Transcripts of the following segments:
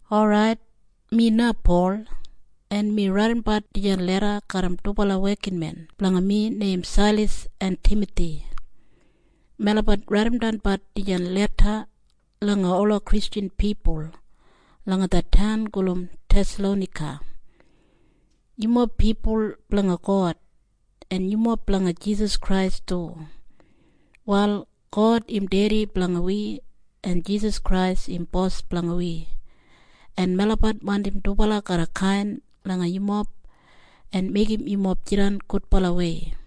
Orait, mi na Pol, en mi raidimdan dijan leda garram dubala wekinmen blanga mi neim Sailas en Timathi. Melabat raidimdan dijan leda langa ola Kristjan pipul langa det taun gulum Thesalonaika. Yumob pipul blanga God, en yumob blanga Jisas Krais du. Wal God im Dedi blanga wi, en Jisas Krais im Bos blanga wi. En melabat wandim dubala garra kain langa yumob en meigim yumob jidan gudbalawei.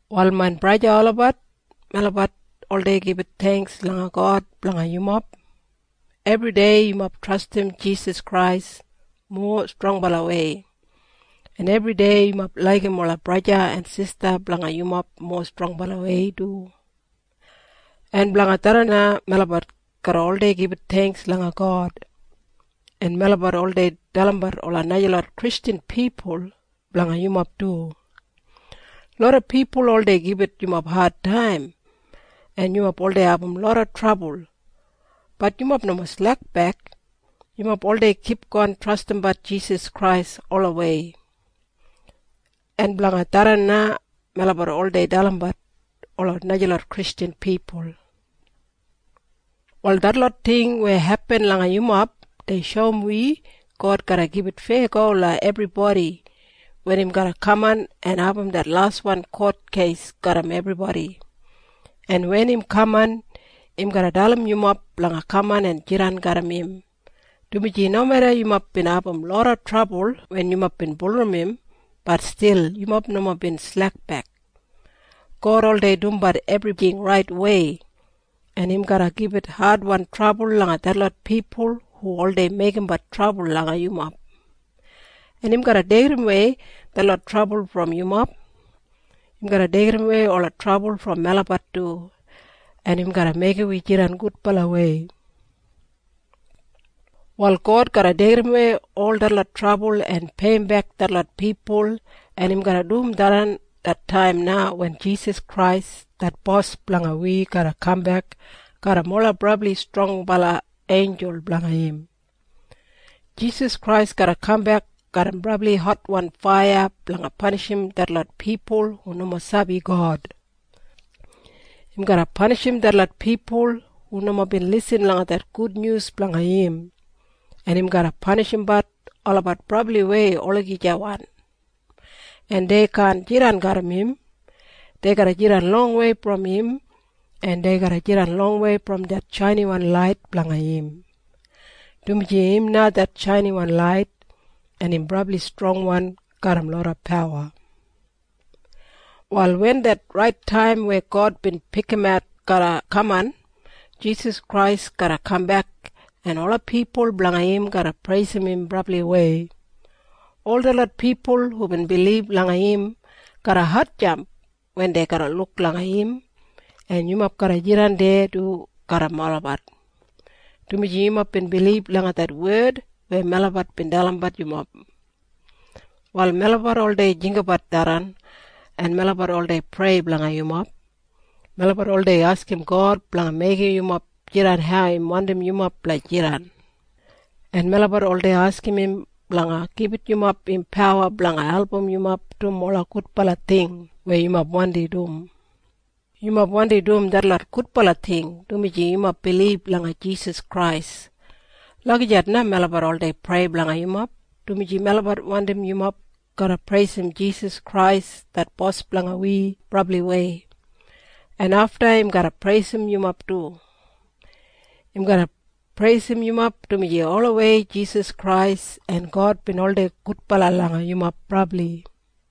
Wal main braja en sista olabat, melabat oldei gibit theingks langa God blanga yumob. Ebridei yumob trastim Jisas Krais mowa strongbalawei, en ebridei yumob laigim ola braja en sista blanga yumob mowa strongbalawei du. En blanga tharran na melabat garra oldei gibit theingks langa God. En melabat oldei dalimbat ola najalot Kristjan pipul blanga yumob du. Loda pipul oldei gibit yumob adtaim, en yumob oldei abum loda trabul. Bat yumob nomo slekbek. Yumob oldei kipgon trastimbat Jisas Krais olawei. En blanga tharran na melabat oldei dalimbat ola najalot Kristjan pipul. Wal detlot ting weya hepin langa yumob, dei shoum wi God garra gibit feyago langa ebribodi wen im garra kaman en abum det laswan kotkeis garram ebribodi. En wen im kaman, im garra dalim yumob blanga kaman en jidan garram im, dumaji nomeda yumob bin abum loda trabul wen yumob bin bulurrum im, bat stil yumob nomo bin slekbek. God oldei dumbat ebrijing raitwei, en im garra gibit adwan trabul langa detlot pipul hu oldei meigimbat trabul langa yumob, en im garra deigidawei detlot trabul brom yumob. Im garra deigidawei ola trabul brom melabat du, en im garra meigim wi jidan gudbalawei. Wal God garra deigidawei ol detlot trabul en peiyimbek detlot pipul, en im garra dum tharran, det taim na wen Jisas Krais det Bos blanga wi garra kambek garram ola brabli strongbala einjul blanga im. Jisas Krais garra kambek garram brabli hotwan faiya blanga panishim detlot pipul hu nomo sabi God. Im garra panishim detlot pipul hu nomo bin lisin langa det Gudnyus blanga im, en im garra panishimbat olabat brabliwei olagijawan, en dei kaan jidan garram im. Dei garra jidan longwei brom im, en dei garra jidan longwei brom det shainiwan lait blanga im, dumaji im na det shainiwan lait, en im brabli strongwan garram loda pawa. Wal wen det rait taim weya God bin pikimat garra kaman, Jisas Krais garra kambek, en ola pipul blanga im garra preisim im brabliwei. Ol detlot pipul hubin bilib langa im, garra hatjamp wen dei garra luk langa im, en yumob garra jidan deya du garram olabat, dumaji yumob bin bilib langa det wed weya melabat bin dalimbat yumob. Wal melabat oldei jinggabat tharran, en melabat oldei prei blanga yumob. Melabat oldei askim God blanga meigim yumob jidan hau im wandim yumob blanga jidan, en melabat oldei askim im blanga gibit yumob im pawa blanga album yumob dum ola gudbala ting weya yumob wandi dum. Yumob wandi dum detlot gudbala ting dumaji yumob bilib langa Jisas Krais. Lagijat na melabat oldei prei blanga yumob, dumaji melabat wandim yumob garra preisim Jisas Krais det Bos blanga wi brabliwei. En afta im garra preisim yumob du. Im garra preisim yumob, dumaji olawei Jisas Krais en God bin oldei gudbala langa yumob brabli.